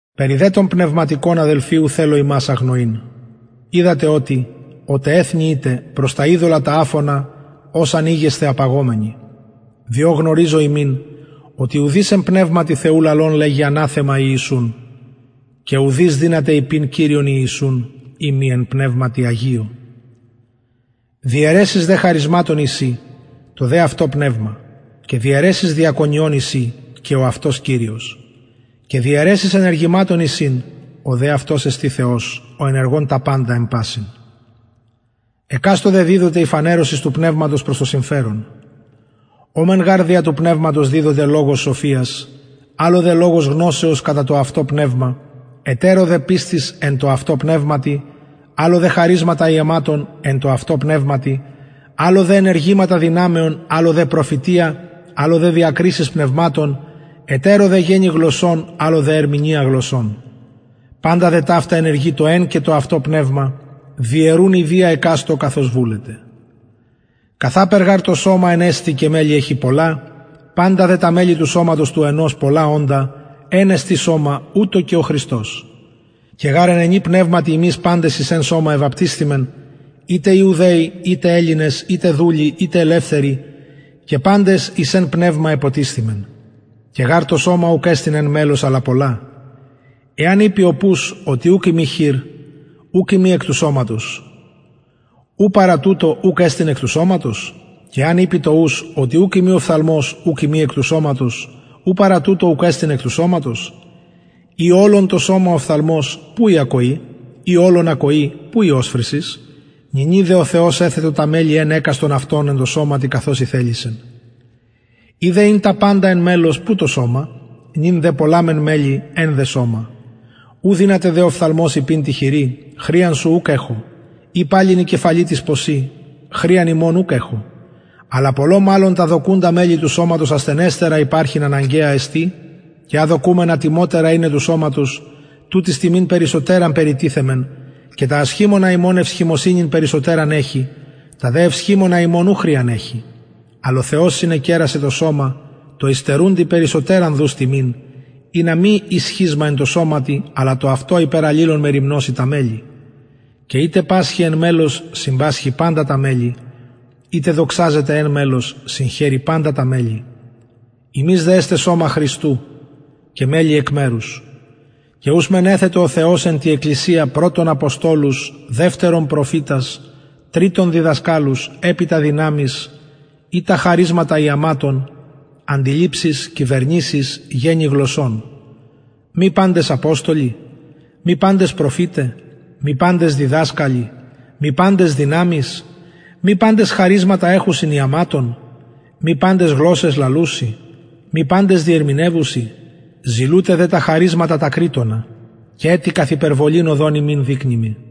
περι δε των πνευματικων αδελφοι ου θελω υμας αγνοειν οιδατε οτι οτε εθνη ητε προς τα ειδωλα τα αφωνα ως αν ηγεσθε απαγομενοι διο γνωριζω υμιν οτι ουδεις εν πνευματι θεου λαλων λεγει αναθεμα ιησουν και ουδεις δυναται ειπειν κυριον ιησουν ει μη εν πνευματι αγιω διαιρεσεις δε χαρισματων εισιν το δε αυτο πνευμα και διαιρεσεις διακονιων εισιν και ο αυτος κυριος και διαιρεσεις ενεργηματων εισιν ο δε αυτος εστιν θεος ο ενεργων τα παντα εν πασιν εκαστω δε διδοται η φανερωσις του πνευματος προς το συμφερον ω μεν γαρ δια του πνευματος διδοται λογος σοφιας αλλω δε λογος γνωσεως κατα το αυτο πνευμα ετερω δε πιστις εν τω αυτω πνευματι αλλω δε χαρισματα ιαματων εν τω αυτω πνευματι αλλω δε ενεργηματα δυναμεων αλλω δε προφητεια αλλω δε διακρισεις πνευματων ετερω δε γενη γλωσσων αλλω δε ερμηνεια γλωσσων παντα δε ταυτα ενεργει το εν και το αυτο πνευμα διαιρουν ιδια εκαστω καθως βουλεται καθαπερ γαρ το σωμα εν εστιν και μελη εχει πολλα παντα δε τα μελη του σωματος του ενος πολλα οντα εν εστιν σωμα ουτως και ο χριστος και γαρ εν ενι πνευματι ημεις παντες εις εν σωμα εβαπτισθημεν ειτε ιουδαιοι ειτε ελληνες ειτε δουλοι ειτε ελευθεροι και παντες εις εν πνευμα εποτισθημεν και γαρ το σωμα ουκ εστιν εν μελος αλλα πολλα εαν ειπη ο πους οτι ουκ ειμι χειρ ουκ ειμι εκ του σωματος ου παρα τουτο ουκ εστιν εκ του σωματος και εαν ειπη το ους οτι ουκ ειμι οφθαλμος ουκ ειμι εκ του σωματος ου παρα τουτο ουκ εστιν εκ του σωματος ει ολον το σωμα οφθαλμος που η ακοη ει ολον ακοη που η οσφρησις νυνι δε ο θεος εθετο τα μελη εν εκαστον αυτων εν τω σωματι καθως ηθελησεν ει δε ην τα παντα εν μελος που το σωμα νυν δε πολλα μεν μελη εν δε σωμα ου δυναται δε ο οφθαλμος ειπειν τη χειρι χρειαν σου ουκ εχω η παλιν η κεφαλη τοις ποσιν χρειαν υμων ουκ εχω αλλα πολλω μαλλον τα δοκουντα μελη του σωματος ασθενεστερα υπαρχειν αναγκαια εστιν και α δοκουμεν ατιμοτερα ειναι του σωματος τουτοις τιμην περισσοτεραν περιτιθεμεν και τα ασχημονα ημων ευσχημοσυνην περισσοτεραν εχει τα δε ευσχημονα ημων ου χρειαν εχει αλλ ο θεος συνεκερασεν το σωμα τω υστερουντι περισσοτεραν δους τιμην ινα μη η σχισματα εν τω σωματι αλλα το αυτο υπερ αλληλων μεριμνωσιν τα μελη και ειτε πασχει εν μελος συμπασχει παντα τα μελη ειτε δοξαζεται εν μελος συγχαιρει παντα τα μελη υμεις δε εστε σωμα χριστου και μελη εκ μερους και ους μεν εθετο ο θεος εν τη εκκλησια πρωτον αποστολους δευτερον προφητας τριτον διδασκαλους επειτα δυναμεις ειτα χαρισματα ιαματων αντιληψεις κυβερνησεις γενη γλωσσων μη παντες αποστολοι μη παντες προφηται μη παντες διδασκαλοι μη παντες δυναμεις μη παντες χαρισματα εχουσιν ιαματων μη παντες γλωσσαις λαλουσιν μη παντες διερμηνευουσιν ζηλουτε δε τα χαρισματα τα κρειττονα και ετι καθ υπερβολην οδον υμιν δεικνυμι